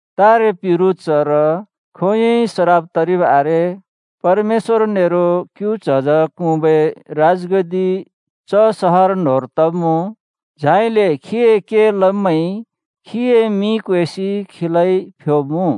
तारे पिरु चर खोंयोंइ सराप तरिब आरे। परमेश्‍वर नेरो क्‍यु च्हज क्हुँबै राजगद्दि च सहर न्‍होंर तब्‍मुँ। झाइले खीए के लब्‍मैंइ खीए मिं क्वेसि खीलाइ फ्‍योब्‍मुँ।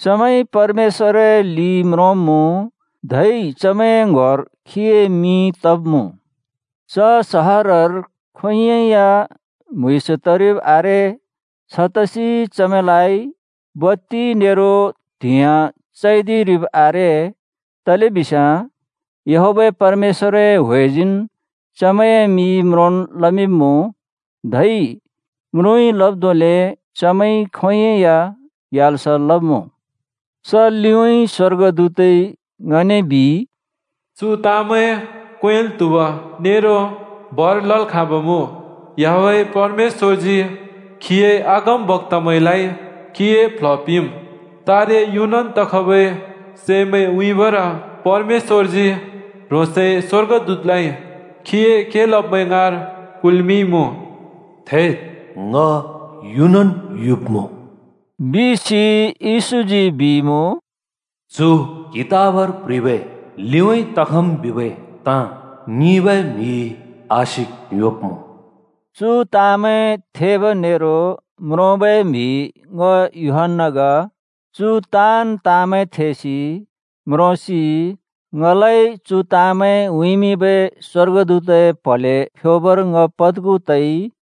चमैंइ परमेश्‍वरए लि म्रोंब्‍मुँ, धै चमैंए ङ्‌होर खीए मिं तब्‍मुँ। च सहरर खोंयोंइ या म्‍हुँइँस तरिब् आरे। छतसि चमैंलाइ बत्ति नेरो त्‍हिंयाँ चैदिरिब आरे, तलेबिस्याँ याहवेह परमेश्‍वरए ह्‍वेजीन् चमैंए मि म्रोंल् लमिंब्मुँ। धै म्रुँइ लब् धोंले चमैंइ खोंयोंइ या ग्याल्स लब्‍मुँ! च लिउँइँ स्‍वर्गदूतइ ङने बिइ, “चु ताँमैं क्वेंल् त्हुब नेरो भर लल् खाँब् मुँ। याहवेह परमेश्‍वरजी खीए अगमबक्‍तामैंलाइ खीए प्ल्ह पिंम्। तारे युनन् तखबै सैमैं उँइँबर परमेश्‍वरजी ह्रोंसए स्‍वर्गदूतलाइ खीए के लब्मैं ङाँर कुल्मिंइमुँ।” “थेद्! ङ युनन् युब्‍मुँ बिसि,” येशूजी बिइमुँ। “चु कितबर प्ह्रिबै ‘लिउँइँ तखम्’ बिबै ताँ ङिंबै म्‍हिइ आशिक योंब्मुँ।” चु ताँमैं थेब नेरो म्रोंबै म्हि ङ यूहन्‍ना ग। चु ताँन् ताँमैं थेसि, म्रोंसि, ङलाइ चु ताँमैं उँइँमिंबै स्‍वर्गदूतए प्‍हले फ्‍योबर ङ पद्खु तइ।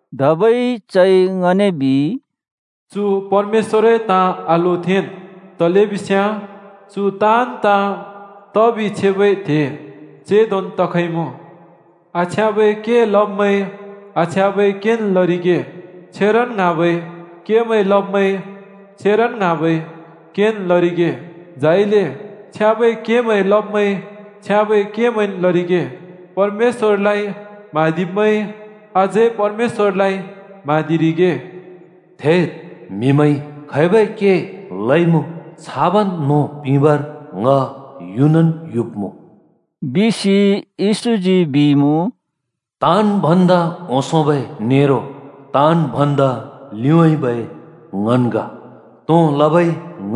धबै चइ ङने बिइ, “चु परमेश्‍वरए ताँ आलोथेंन्, तलेबिस्याँ चु ताँन् ताँ तबि छेबै त्हे चेंदोन् तखइमुँ। आछ्याँबै के लब्मैंइ आछ्याँबै केन् लरिगे, छेरन् ङ्हाँबै केमैं लब्मैंइ छेरन् ङ्हाँबै केन् लरिगे। झाइले छ्याँबै केमैं लब्मैंइ छ्याँबै केमैंन् लरिगे, परमेश्‍वरलाइ म्हाँदिब्मैइ अझै परमेश्‍वरलाइ म्हाँदिरिगे।” “थेद्! म्हिमैंइ खैबै के लइमुँ छाबन् नों पिंबर ङ युनन् युब्‍मुँ बिसि,” येशूजी बिइमुँ। “ताँन् भन्दा ओंसोंबै नेरो ताँन् भन्दा लिउँइँबै ङन् ग, तों लबै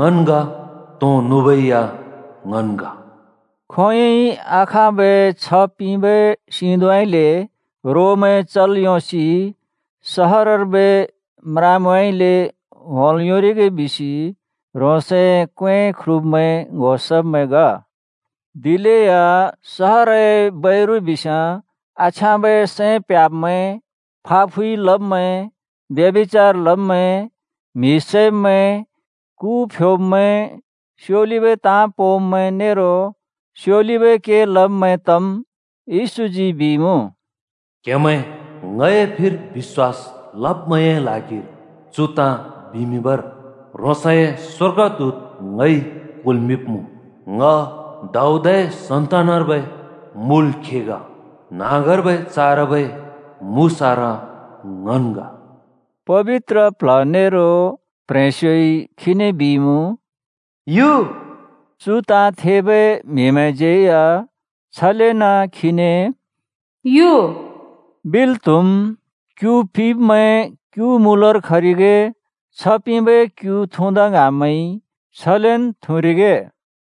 ङन् ग, तों नुबै या ङन् ग।” खोंयोंइ आखाँबै छ्ह पिंबै सिंधुँउँइँले रोमैं चल् योंसि सहरर्बै म्रामैंउँइँले होंल् योंरिगे बिसि ह्रोंसए क्‍वें ख्रुब्‍मैं ङ्‍हो सब्मैं ग। दिलेया सहरए बैरु बिस्याँ आछ्याँबै सैं प्ह्‍याब्मैं: फाफुइ लब्मैं, ब्यभिचार लब्मैं, म्हि सैब्मैं, कु फ्योब्‍मैं, स्‍योलिबै ताँ पोंब्‍मैं नेरो स्‍योलिबै के लब्मैं तम्। येशूजी बिइमुँ, “क्हेमैं ङए फिर बिश्‍वास लब्‍मैंए ल्हागिर चु ताँ बिमिंबर ह्रोंसए स्‍वर्गदूत ङइ कुल्मिंइमुँ। ङ दाऊदए सन्‍तानर्बै मुल खे ग। न्‍हाँगर्बै चारबै मुसारा ङन् ग।” पबित्र प्ल्ह नेरो प्‍ह्रेंस्‍योइ खीने बिइमुँ, “यु”। चु ताँ थेबै म्हिमैंज्यै या छलेन खीने “यु” बिल् त्‍हुम्। क्‍यु पिब्मैं क्‍यु मूलर खरिगे। छ्ह पिंबै क्‍यु थुँदा ङ्हाँब्मैंइ छलेन् थुँरिगे।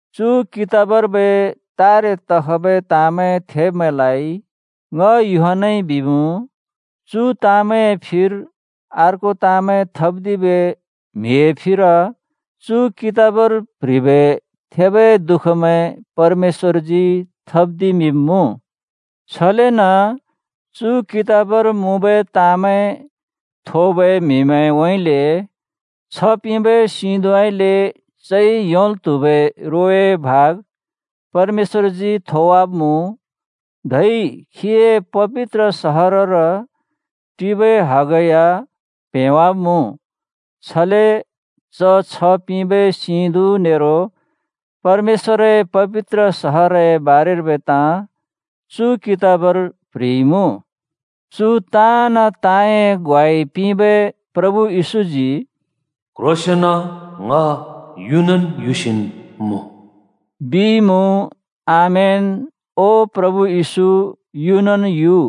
चु कितबर्बै तारे तखबै ताँमैं थेब्‍मैंलाइ ङ यूहन्‍नाइ बिमुँ: चु ताँमैंए फिर अर्को ताँमैं थप्‍दिबै म्हिए फिर चु कितबर प्‍ह्रिबै थेबै दुःखमैं परमेश्‍वरजी थप्‍दिमिंब्‍मुँ। छलेन चु कितबर मुँबै ताँमैं थोबै म्हिउँइँले छ्ह पिंबै सिधुँउँइँले चइ योंल् त्हुबै रोए भाग परमेश्‍वरजी थोवाब्‍मुँ, धै खीए पबित्र सहरर टिबै हग या प्हेंवाब्‍मुँ। छले च छ्ह पिंबै सिंधुँ नेरो परमेश्‍वरए पबित्र सहरए बारेर्बै ताँ चु कितबर प्ह्रिइमुँ। चु ताँन् ताँए ग्वाइ पिंबै प्रभु येशूजी “क्ह्रोंसेंन, ङ युनन् युसिन् मुँ,” बिइमुँ। आमेन! ओ प्रभु येशू, युनन् यु!